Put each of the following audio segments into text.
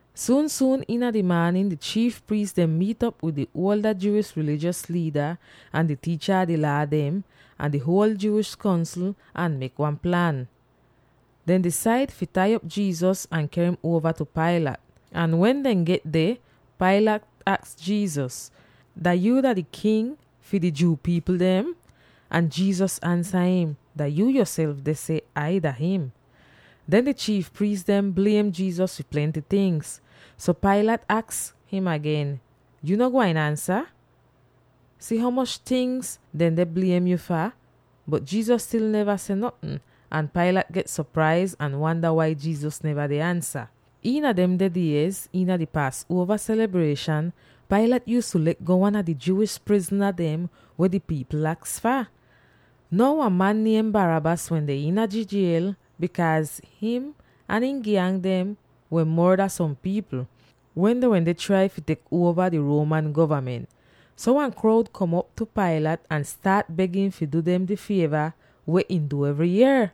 Suun-suun iina di maanin di chiif priis dem miit'op wid di ada Jewish rilijos liida, ahn di tiicha a di Laa dem, ahn di huol Jewish Kongsl ahn mek wan plan: dehn disaid fi tai op Jesus ahn ker im uova tu Pilate. Ahn wen dehn get deh, Pilate aks Jesus, “Dah yuu dah di King fi di Jew pipl dem?” Ahn Jesus ansa im, “Dah yu yoself deh seh Ai dah him.” Or: “Yu don sehso yoself.” Den di chiif priis dem bliem Jesus fi plenty tingz. So Pilate aks im agen, “Yu no gwain ansa? Si ho moch tingz deh bliem yu fah!” Bot Jesus stil neva seh notn, ahn Pilate get sopraiz ahn wanda wai Jesus neva deh ansa. Iina demde diez iina di Paasuova selibrieshan, Pilate yuuztu le'go wan a di Jewish prizna dem weh di pipl aks fah. Now wan man niem Barabbas wende iina di jiel, bikaaz him ahn ihn gyang dem wehn morda som pipl, wen dehn wende trai fi tek uova di Roman govament. So wan kroud kom op tu Pilate ahn staat beg im fi du dem di fieva weh ihn du evry yier.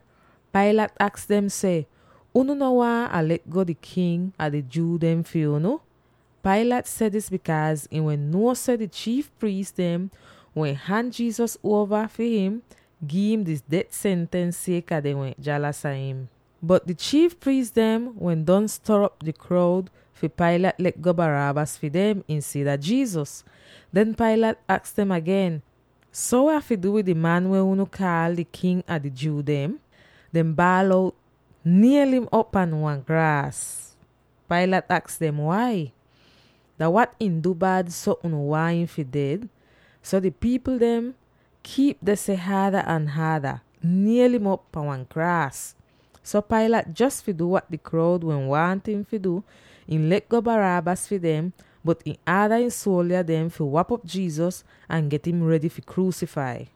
Pilate aks dem seh, “Unu no waahn Ah le'go di King a di Jew dem fi unu?” Pilate seh dis bikaaz ihn wehn nuo seh di chiif priis dem wehn han Jesus uova fi ihn gi'im di det sentens sieka dehn wehn jalas afta him. Bot di chiif priis dem wehn don stor'op di kroud fi Pilate le'go Barabbas fi dem insida Jesus. Den Pilate aks dem agen, “So weh Ah fi du wid di man weh unu kaal di King a di Jew dem?” Dehn baal out, “Niel'im op pan wan kraas!” Pilate aks dem, “Wai? Dah wat ihn du bad, so unu waahn im fi ded?” Bot di pipl dem kiip deh seh haada ahn haada, “Niel'im op pan wan kraas!” So Pilate, jos fi du wat di kroud wehn waahn ihn fi du, ihn le'go Barabbas fi dem, bot ihn aada ihn suoldya dem fi wap'op Jesus, ahn get im redy fi kruusifai.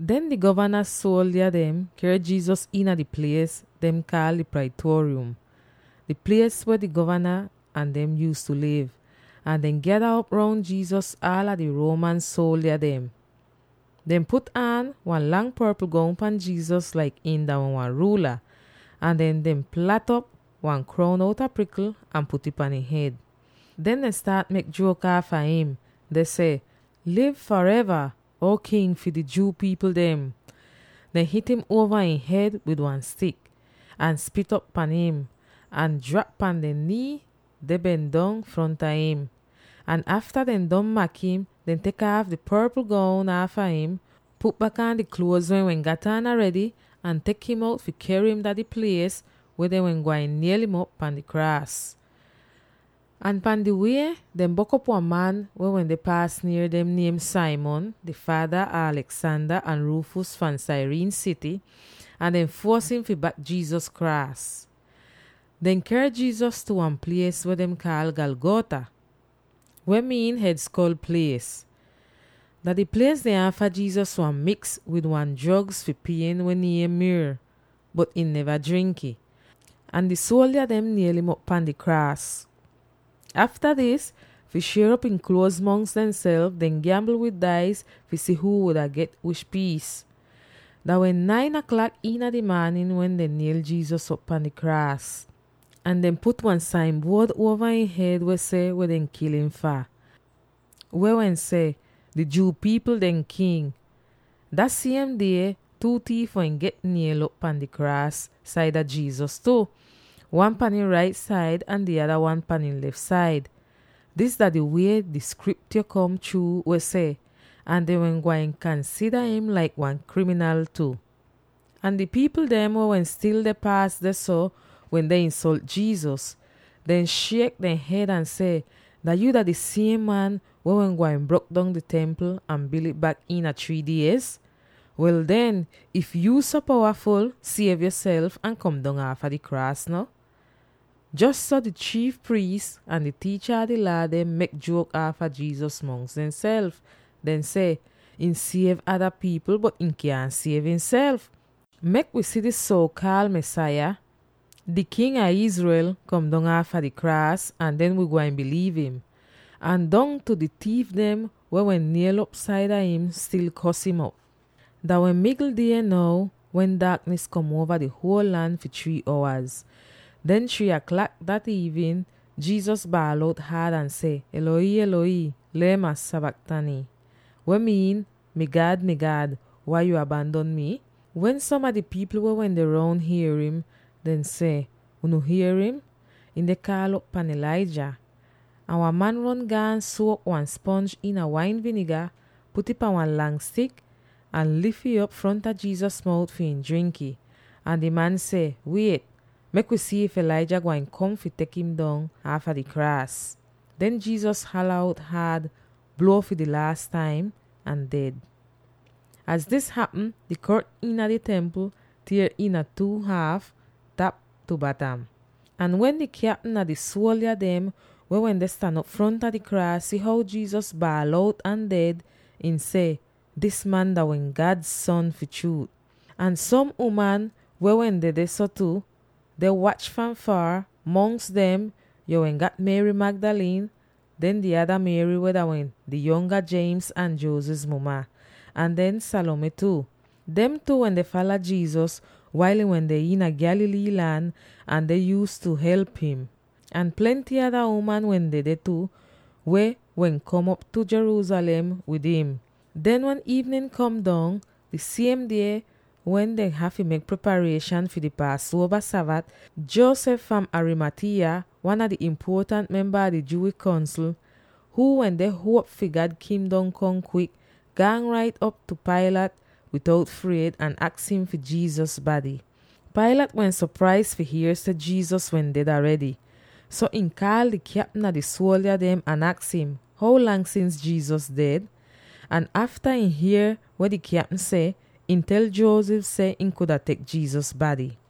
Den di govana suoldya dem ker Jesus iina di plies dehn kaal di Praetorium —di plies weh di govana ahn dem yuuztu liv— ahn dehn gyada op roun Jesus aala di Roman suoldya dem. Dehn put aan wan lang porpl goun pan Jesus laik him dah wan ruula, ahn den dehn plat'op wan kroun outa prikl ahn put'ih pan ihn hed. Den dehn staat mek juok aafa im, deh seh, “Liv fareva, Uo King fi di Jew pipl dem!” Dehn hit'im uova ihn hed wid wan stik, ahn spit op pahn im, ahn drap pan dehn nii deh ben dong fronta im. Ahn afta dehn don mak im, dehn tek aaf di porpl goun aafa im, put bak aan di kluoz weh ihn wehn gat aan aredy, ahn tek im out fi ker im dah di plies weh dehn wehn gwain niel'im op pan di kraas. Ahn pahn di wie, dehn bok'op wan man weh wende paas nier dem, niem Simon, Alexander ahn Rufus pupa fahn Cyrene sity; ahn dehn fuos im fi bak Jesus kraas. Dehn ker Jesus tu wan plies weh dehn kaal Golgotha, weh miin “Hed Skol Plies.” Dah di plies dehn aafa Jesus wain miks wid wan drogz fi pien weh niem “myrrh,” bot ihn neva drink'ih. Ahn di suoldya dem niel'im op pan di kraas. Afta dis, fi shier op ihn kluoz mongs dehnself, dehn gyambl wid dais fi si huu wuda get wish piis. Dah wehn nine aklak iina di maanin wen dehn niel'op Jesus pan di kraas. Ahn dehn put wan sain buod uova ihn hed weh seh weh dehn kil im fah, weh wehn seh: “Di Jew pipl dehn King.” Dah siem die two tiif wehn get niel'op pahn two kraas saida Jesus tu; wan pahn ihn rait said ahn di nada wan pahn ihn lef said. [Dis dah di wie di Skriptyo kom chruu weh seh, “Ahn dehn wehn gwain kansida im laik wan kriminal tu.”] Ahn di pipl dem weh wehn stil deh paas dehso wende insolt Jesus, deh shiek dehn hed, ahn seh, “Dah yuu di siem man weh wehn gwain brok dong di Templ ahn bil'ih bak iina three diez? Wel den, if yuu so powaful, siev yoself ahn kom dong aafa di kraas no!” Jos so di chiif priis ahn di tiicha a di Laa dem mek juok aafa Jesus mongs dehnself, deh seh, “Ihn siev ada pipl, bot ihn kyaahn siev ihnself. Mek wi si dis suo-kaal Mesaya, di King a Israel, kom dong aafa di kraas, ahn den wii gwain biliiv im!” Ahn dongtu di tiif dem weh wehn niel'op saida im stil kos im op. Dah wehn migl die now, wen daaknis kom uova di huol lan fi three owaz. Den three aklak dah iivnin Jesus baal out haad ahn seh, “Eloi, Eloi, lema sabachthani!” weh miin, “Mi God, Mi God, wai yo abandon mi?” Wen som a di pipl weh wende roun hier im, dehn seh, “Unu hier im! Ihn deh kaal'op pahn Elijah!” Ahn wan man ron gaan suok wan sponj iina wain viniga, put'ih pan wan lang stik, ahn lif ih op fronta Jesus mout fi ihn drink'ih, ahn di man seh, “Wiet! Mek wi si if Elijah gwain kom fi tek im dong aafa di kraas!” Den Jesus hala out haad, bluo fi di laas taim, ahn ded. Az dis hapm, di kortn iina di Templ tier iina two fahn tap tu batam. Ahn wen di kyapm a di suoldya dem weh wende stan op fronta di kraas si how Jesus baal out ahn ded, ihn seh, “Dis man dah wehn God Son fi chruut!” Ahn som uman wende dehso tu, deh wach fahn foor: mongs dem yo wehn gat Mary Magdalene, den di ada Mary weh dah wehn di yonga James ahn Joses muma, ahn den Salome tu. Dem tu wende fala Jesus wail ihn wende iina Galilee lan ahn dehn yuuztu help im. Ahn plenty ada uman wehn dedeh tu, weh wehn kom op tu Jerusalem wid im. Den wen iivnin kom dong, di siem die wen dehn hafy mek preparieshan fi di Paasuova Sabat, Joseph fahn Arimathea, wan a di impuotant memba a di Jewish Kongsl, huu wende huop fi God Kingdom kom kwik, gaan rait op tu Pilate bitout fried ahn aks im fi Jesus bady. Pilate wehn sopraiz fi hier seh Jesus wehn ded aredy. So ihn kaal di kyapm a di suoldya dem ahn aks im, “How lang sins Jesus ded?” Ahn afta ihn hier weh di kyapm seh, ihn tel Joseph seh ihn kuda tek Jesus bady.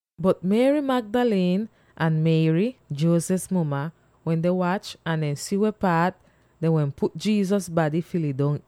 Bot Mary Magdalene, ahn Mary, Joses muma, wende wach ahn dehn si weh paat dehn wehn put Jesus bady fi lidong.